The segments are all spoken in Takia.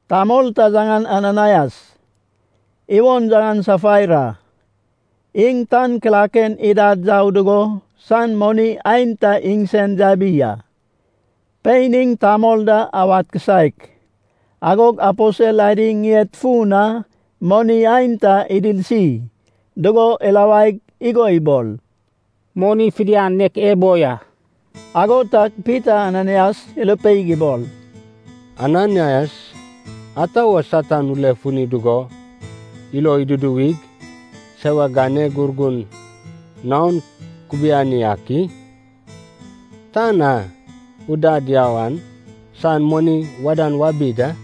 Tamol ta yaŋan Ananaias, iwon yaŋan Safaira. Iŋ tan kilaken idad yau dugo san moni aenta iŋsen yabi a. Pein iŋ tamol da awad kisaek. Agog aposel adi ŋied fun na moni aenta idirsi dugo irawaig igo ibol, “Moni fidian nek ebo ya.” Ago tag Pita Ananaias irupeig ibol, “Ananaias, ata wo Satan ulefuni dugo ilo iduduwig, sewak ganeg Urgun naon kubiani ak i? Tan a udad yau an san moni wadan wabi da.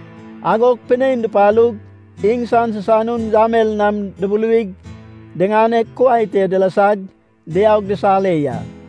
Agog pinein dupalug, iŋsan sisanun yamel nam dubuluwig diŋaneg kuai te dilasag diaug disare ya.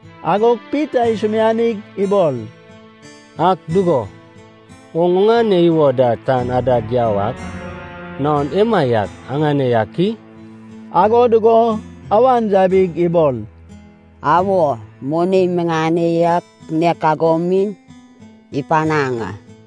Agog Pita isumianig ibol, “Ak dugo, oŋ oŋane iwo da tan adad yau ak naon emaiak aŋane yak i?” Ago dugo awan yabig ibol, “Awo, moni miŋane yak nek ago mi ipanaŋ a.”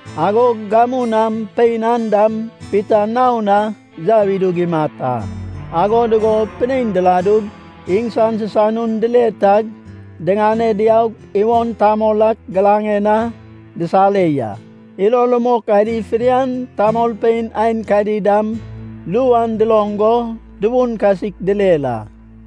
Agog gamu nam pein an dam Pita naon na yau idug imat a. Ago dugo pinein diladug iŋsan sisanun dile tag diŋane diaug iwon tamol ak giraŋen na disare ya. Ilo rumok adi fidian, tamolpein aenkadi dam, ru an duloŋ go tubun kasik direr a.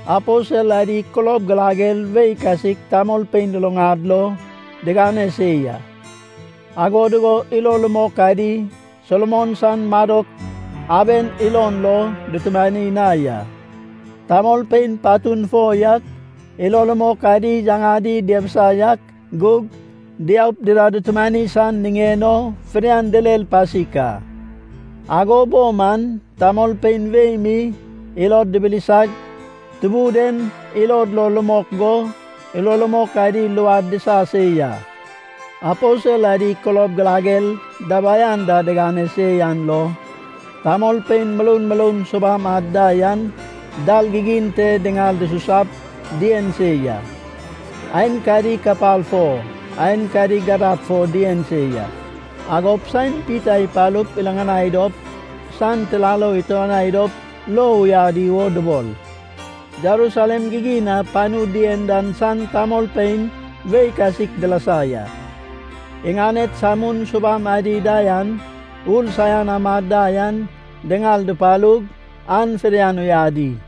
Aposel adi kulob girager wei kasik tamolpein luluŋad lo digane se ya. Ago dugo ilo rumok adi Solomon san Madok Aben ilon lo dutumani na ya. Tamolpein patun fo yak ilo rumok adi yaŋadi diabisa yak gug, diaup dida dutumanai san niŋen o fidian direr pasik a. Ago bo man tamolpein wei mi ilod dibilisag, Tubun en ilod lo rumok go ilo rumok adi luad disa se ya. Aposel adi kulob girager dabai anda digane se yan lo, tamolpein muroud muroud subam ad da yan dal gigin te diŋal dususap dien se ya. Aenkadi kapal fo, aenkadi gadab fo dien se ya. Agop saen Pita ipalup iriŋanai dop san tirarou ituanai dop lo uyadi wo dubol. Jerusalem gigin na panu dien dan san tamolpein wei kasik dilasa ya. Iŋaned samun subam adi da yan, ur saian amad da yan diŋal dupalug, an fidian uyadi.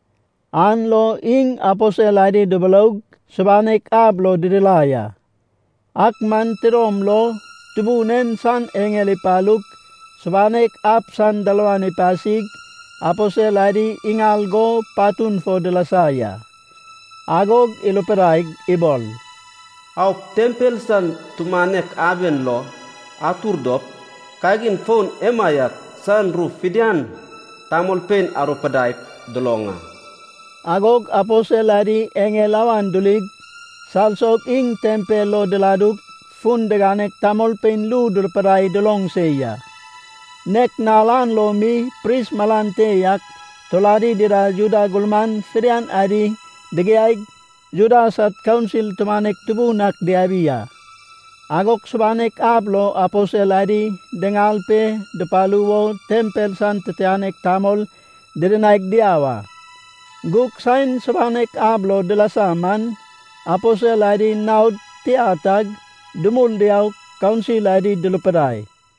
An lo iŋ aposel adi duburoug, subanek ab lo didirai a. Ak man tidom lo Tubun en san eŋel ipalug subanek ab san dalawan ipasig, aposel adi iŋal go patun fo dilasa ya. Agog irupidaig ibol, “Aup, tempel san tumanek aben lo atur dop, kagin foun emaiak san ru fidian tamolpein arupidaip duloŋ a.” Agog aposel adi eŋel awan durig, salsog iŋ tempel lo diladug fun diganeg tamolpein ru durupidai duloŋ se ya. Nek nal an lo mi pris malan te yak, turadi dida Juda gurman fidian adi digiaig, Juda sad Kaunsil tumanek tubun ak diabi a. Agog subanek ab lo aposel adi diŋal pe dupalu wo tempel san titianek tamol didinaig diau a. Gug saen subanek ab lo dilasa man, aposel adi naod tia tag dumul diaug, kaunsil adi durupidai,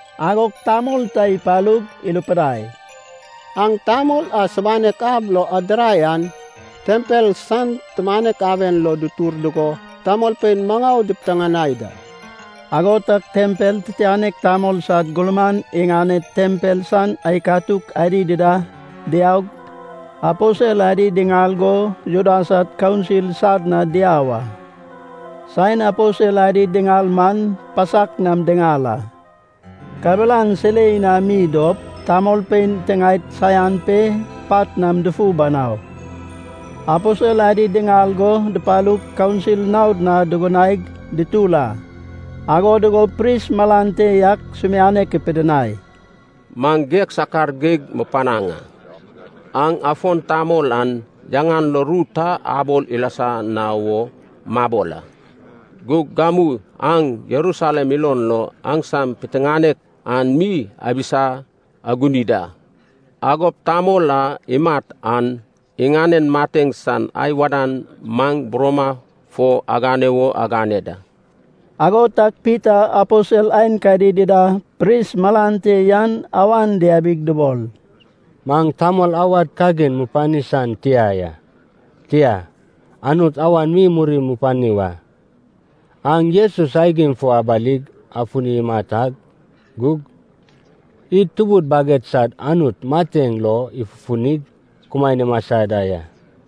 Agog tamol ta ipalug irupidai, “Aŋ tamol a subanek ab lo adirai an tempel san tumanek aben lo dutur dugo tamolpein maŋau dipiteŋanai da.” Ago tag tempel titianek tamol sad gurman iŋanen tempel san aikatuk adi dida diaug, aposel adi diŋal go Juda sad Kaunsil sad na diau a. Saen aposel adi diŋal man pasak nam diŋal a. Kabelan silei nam mi dop, tamolpein tiŋaed saian pe pat nam dufu banau. Aposel adi diŋal go dupalug kaunsil naod na dugunaig dutur a. Ago dugug pris malan te yak sumianek ipidinai, “Maŋ geg sakar geig mupanaŋ a. Aŋ afon tamol an yaŋan lo ru ta abol ilasa na wo mabol a. Gug gamu aŋ Jerusalem ilon lo aŋsam piteŋanek an mi abisa aguni da. Agop tamol a imat an iŋanen mateŋ san ai wadan maŋ buroma fo agane wo agane da.” Ago tag Pita aposel aenkadi dida pris malan te yan awan diabig dubol, “Maŋ tamol awad kagin mupani san tia ya, tia, Anut awan mi muri mupani wa. Aŋ Jesus aigim fo abalig afuni imat ak gug, id tubud baged sad Anut mateŋ lo ifufunig kumaen imasa da ya.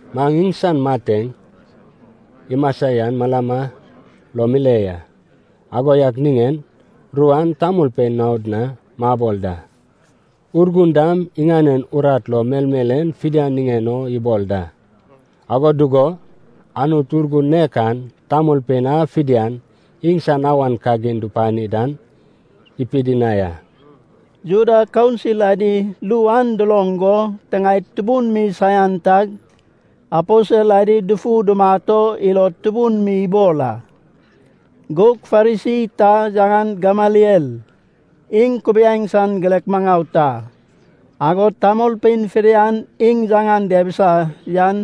Maŋ iŋsan mateŋ, imasa yan malama lo mile ya. Ago yak niŋen ru an tamolpein naod na mabol da. Urgun dam iŋanen urat lo melmel en fidian niŋen o ibol da. Ago dugo Anut Urgun nek an tamolpein a fidian iŋsan awan kagin dupani dan ipidinai a.” Juda Kaunsil adi ru an duloŋ go tiŋaed tubun mi saian tag, aposel adi dufu dumat o ilod tubun mi ibol a. Gug Farisi ta yaŋan Gameliel, iŋ kubiaeŋ san girek maŋau ta, agod tamolpein fidian iŋ yaŋan diabisa yan,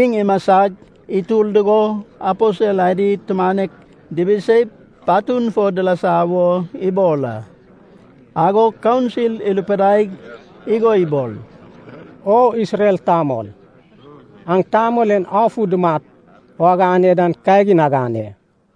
iŋ imasag itur dugo aposel adi tumanek dibiseip patun fo dilasa wo ibol a. Agog kaunsil irupidaig igo ibol, “O Isrel tamol, aŋ tamol en afu dumat o agane dan kagin agane.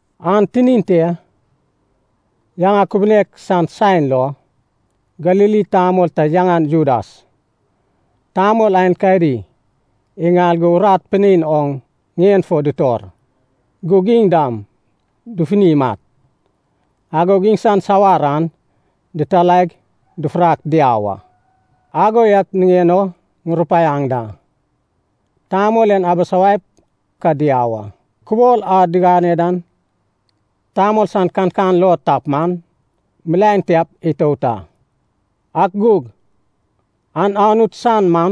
An tinin te, yaŋa kubunek san saen lo, Galili tamol ta yaŋan Judas, tamol aenkadi iŋal go urat pinein oŋ ŋien fo dutor. Gug iŋ dam dufuni imat. Agog iŋsan sawar an dititalaig dufurak diau a. Ago yak niŋen o ŋurupaiaŋ da, tamol en abusawaip ka diau a. Kubol a digane dan tamol sad kankan lo tap man, milaen tiap itout a. Ak gug an Anut san man,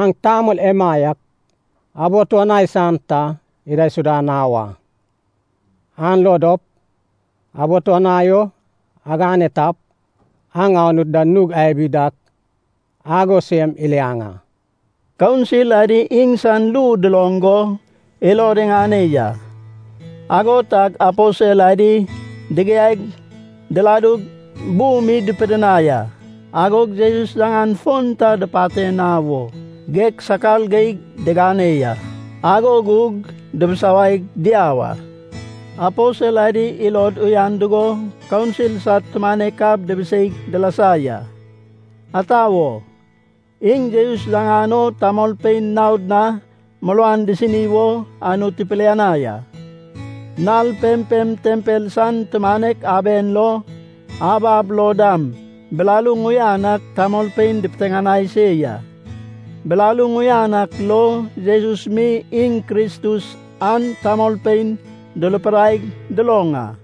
aŋ tamol emaiak abituanai san ta idaisuda na wa. An lo dop abituanai o agane tap, aŋ Anut da nug abi dak ago sem iliaŋ a!” Kaunsil adi iŋsan ru duloŋ go ilod iŋane ya. Ago tag aposel adi digiaig diladug bu mi dupidinai a. Agog Jesus yaŋan fon ta dupate na wo geg sakar geig digane ya. Ago gug dubusawaig diau a. Aposel adi ilod uyan dugo kaunsil sad tumanek ab dibiseig dilasa ya. Ata wo, iŋ Jesus yaŋan o tamolpein naod na muruan disini wo Anut ipilianai a. Nal pempem tempel san tumanek aben lo, ab ab lo dam, bilaluŋ uyan ak tamolpein dupiteŋanai se ya. Bilaluŋ uyan ak lo Jesus mi iŋ Kristus an tamolpein durupidaig duloŋ a.